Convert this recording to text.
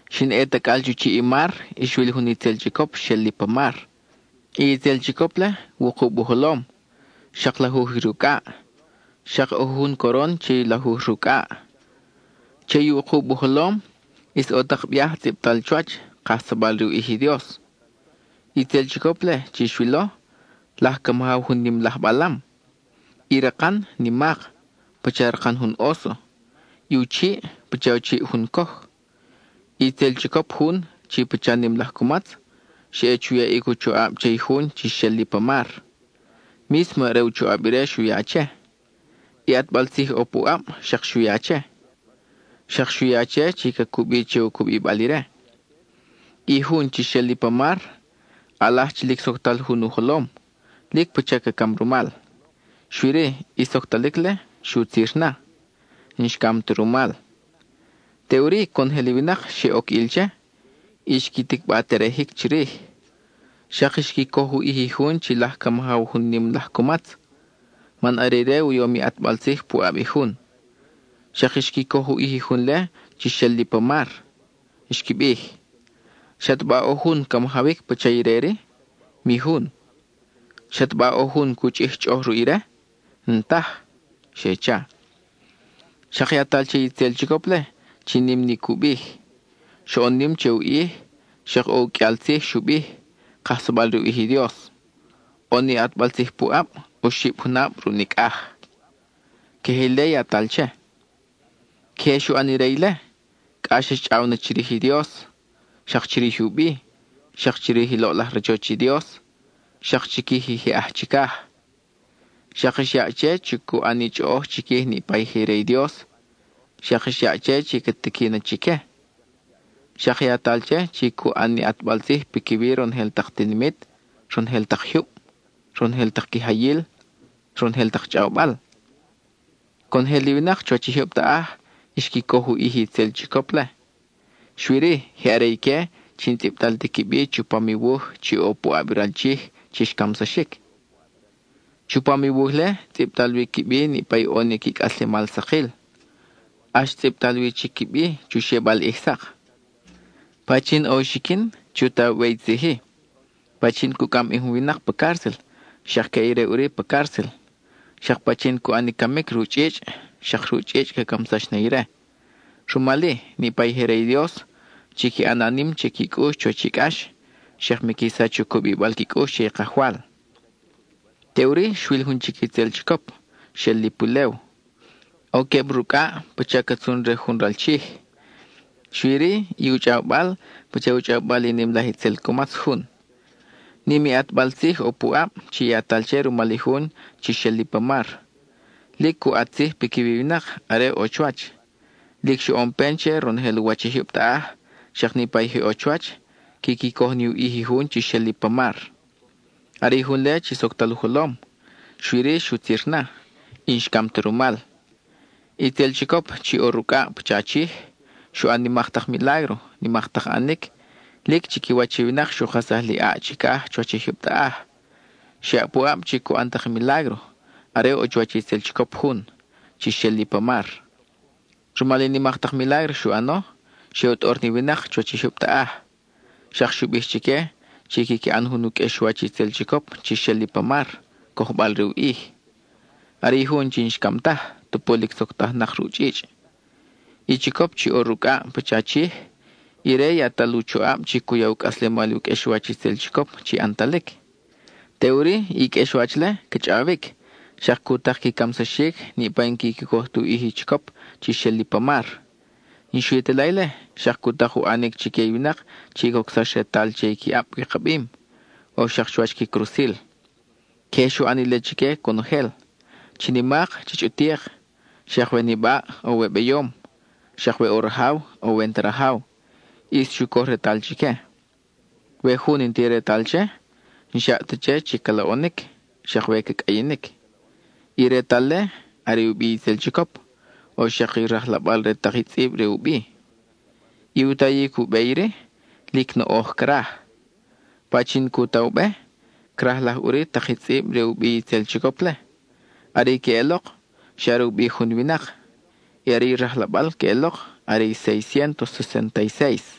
Xin ʼe tacʼal chu chiʼ i mar, y xwil jun itzel chicop xel li pa mar. I itzel chicop-le, wukub u jolom, xak lajuj i rucʼaʼ, xak ʼo jujun coron che i lajuj rucʼaʼ. Y che i wukub u jolom ʼis ʼo tak biaj tzʼibtal chuwach, kajsabal re u ʼij i Dios. I itzel chicop-le chi xwilo, laj ca majaw jun nim laj balam. I rakan, nimak, pacha rakan jun óso; i u chiʼ, pacha u chiʼ jun coj. I itzel chicop jun, chi pacha nim laj cumatz, xa ʼe chu yaʼic u choʼab che i jun chi xel li pa mar. Mísmo are u choʼab ire xu ya che, i ʼatbal tzij ʼo puʼab xak xu ya che. Xak xu ya che chi ca cubi che u cubibal ire. I jun chi xel li pa mar, ʼalaj chi lic soctal jun u jolom, lic pacha ca cam rumal, xui-ri, i soctalic-le xutzir na, n-xcam ta rumal. Teʼuri conojel i winak xe oc ʼil che, y xqui ticba terejic chirij. Xak xqui coj u ʼij i jun chi laj ca majaw jun nim laj cumatz, man are ire u yom i ʼatbal tzij puʼab i jun. Xak xqui coj u ʼij i jun-le chi xel li pa mar; xqui bij: —¿Xataba ʼo jun ca majawic pacha ire-ri? Mi jun. ¿Xataba ʼo jun cu chʼij chʼoʼoj ruʼ ire? N-taj —xe cha. Xak yatal che i itzel chicop-le chi nim ni cu bij; xoʼon nim che u ʼij, xak ʼo u qʼuial tzij xu bij, kajsabal re u ʼij i Dios. ʼO ni ʼatbal tzij puʼab, oxib junab ruʼ nicʼaj. Queje ile yatal che. Queje xu ʼan ire ile; cʼax xchʼaw na chirij i Dios, xak chirij u bi, xak chirij i loʼlaj rachoch i Dios, xak chiquij i je aj chicaj. Xak xyaʼ che chi cu ʼan ni chʼoʼoj chiquij niʼpa i je re i Dios, xak xyaʼ che chi ca tiqui na chique. Xak yatal che chi cu ʼan ni ʼatbal tzij piquiwi ronojel tak tinimit, ronojel tak jyub, ronojel tak quijayil, ronojel tak chʼawbal. Conojel i winak chuwach i jyub taʼaj xqui coj u ʼij i itzel chicop-le; xui-ri, je are ique chi n-tzʼibtal ti qui bi chupam i wuj chi ʼo puʼab i ral Chij chi xcamsaxic. Chupam i wuj-le, tzʼibtal wi qui bi niʼpa i ʼo ni qui cʼaslemal sakil; ʼax tzʼibtal wi chic qui bi chu xebal ʼij sak. Pachin ʼo u xiquin, chu ta u be i tzij-i: pachin cu cʼam bi jun winak pa cárcel, xak ca ʼe ire ʼuri pa cárcel. Xak pachin cu ʼan i camic ruʼ chʼichʼ, xak ruʼ chʼichʼ ca camsax na ire. Rumal-i, niʼpa i je re i Dios, chiqui ʼana nim che qui cʼux chuwach i cʼax, xak miqui sach u cubibal qui cʼux che i Kajwal. Teʼuri xwil jun chic itzel chicop, xel li pulew. ʼO queb rucʼaʼ, pacha ca tzun re jun ral chij; xui-ri, i u chʼawbal pacha u chʼawbal i nim laj itzel cumatz jun. Nim i ʼatbal tzij ʼo puʼab chi yatal che rumal i jun chi xel li pa mar. Lic cu ʼat tzij piquiwi i winak are ʼo chuwach. Lic xoʼon pen che ronojel u wach i jyub taʼaj, xak niʼpa je ʼo chuwach, quiqui coj ni u ʼij i jun chi xel li pa mar. Are i jun-le chi soctal u jolom, xui-ri xutzir na, y n-xcam ta rumal. I itzel chicop chi ʼo rucʼaʼ pacha chij, xu ʼan nimak tak milágro, nimak tak ʼanic; lic chiquiwach i winak xu kajsaj li ʼaʼ chicaj chuwach i jyub taʼaj. Xyaʼ puʼab chi cu ʼan tak i milágro, are ʼo chuwach i itzel chicop jun, chi xel li pa mar. Rumal i nimak tak milágro xu ʼano, xe u tʼor ni winak chuwach i jyub taʼaj. Xak xu bij chique chi quiqui ʼan jun u qʼuexwach i itzel chicop chi xel li pa mar, cojbal re u ʼij; are i jun chi n-xcam taj, tupu lic soctajnak ruʼ chʼichʼ. I chicop chi ʼo rucʼaʼ pacha chij, ire yatal u choʼab chi cu ya u cʼaslemal i u qʼuexwach itzel chicop chi ʼantalic. Teʼuri, i qʼuexwach-le ca chʼawic, xak cu tak qui camsaxic niʼpa i n-quiqui coj ti u ʼij i chicop chi xel li pa mar. Y n-xui ta la ile, xak xu tak u ʼanic chique i winak chi cocsax retal che qui ʼab wikabim, o xak chuwach qui crusil. Queje xu ʼan ile chique conojel; chi nimak chi chʼutik, xak we nibaʼ o we beyom, xak we ʼo rajaw o we n-ta rajaw, ʼis xu coj retal chique. We jun n-ti retal che, n-xyaʼ ta che chi ca loʼonic, xak we ca cʼayinic. I retal-le, are u bi i itzel chicop, o xak i rajlabal re tak i tzʼib re u bi. I u tayic u be iri, lic noʼoj craj. Pachin cu ta u be, crajlaj ʼuri tak i tzʼib re u bi i itzel chicop-le; are i queʼelok xa are u bi jun winak; y are i rajlabal queʼelok are i séis ciéntos sesénta y séis.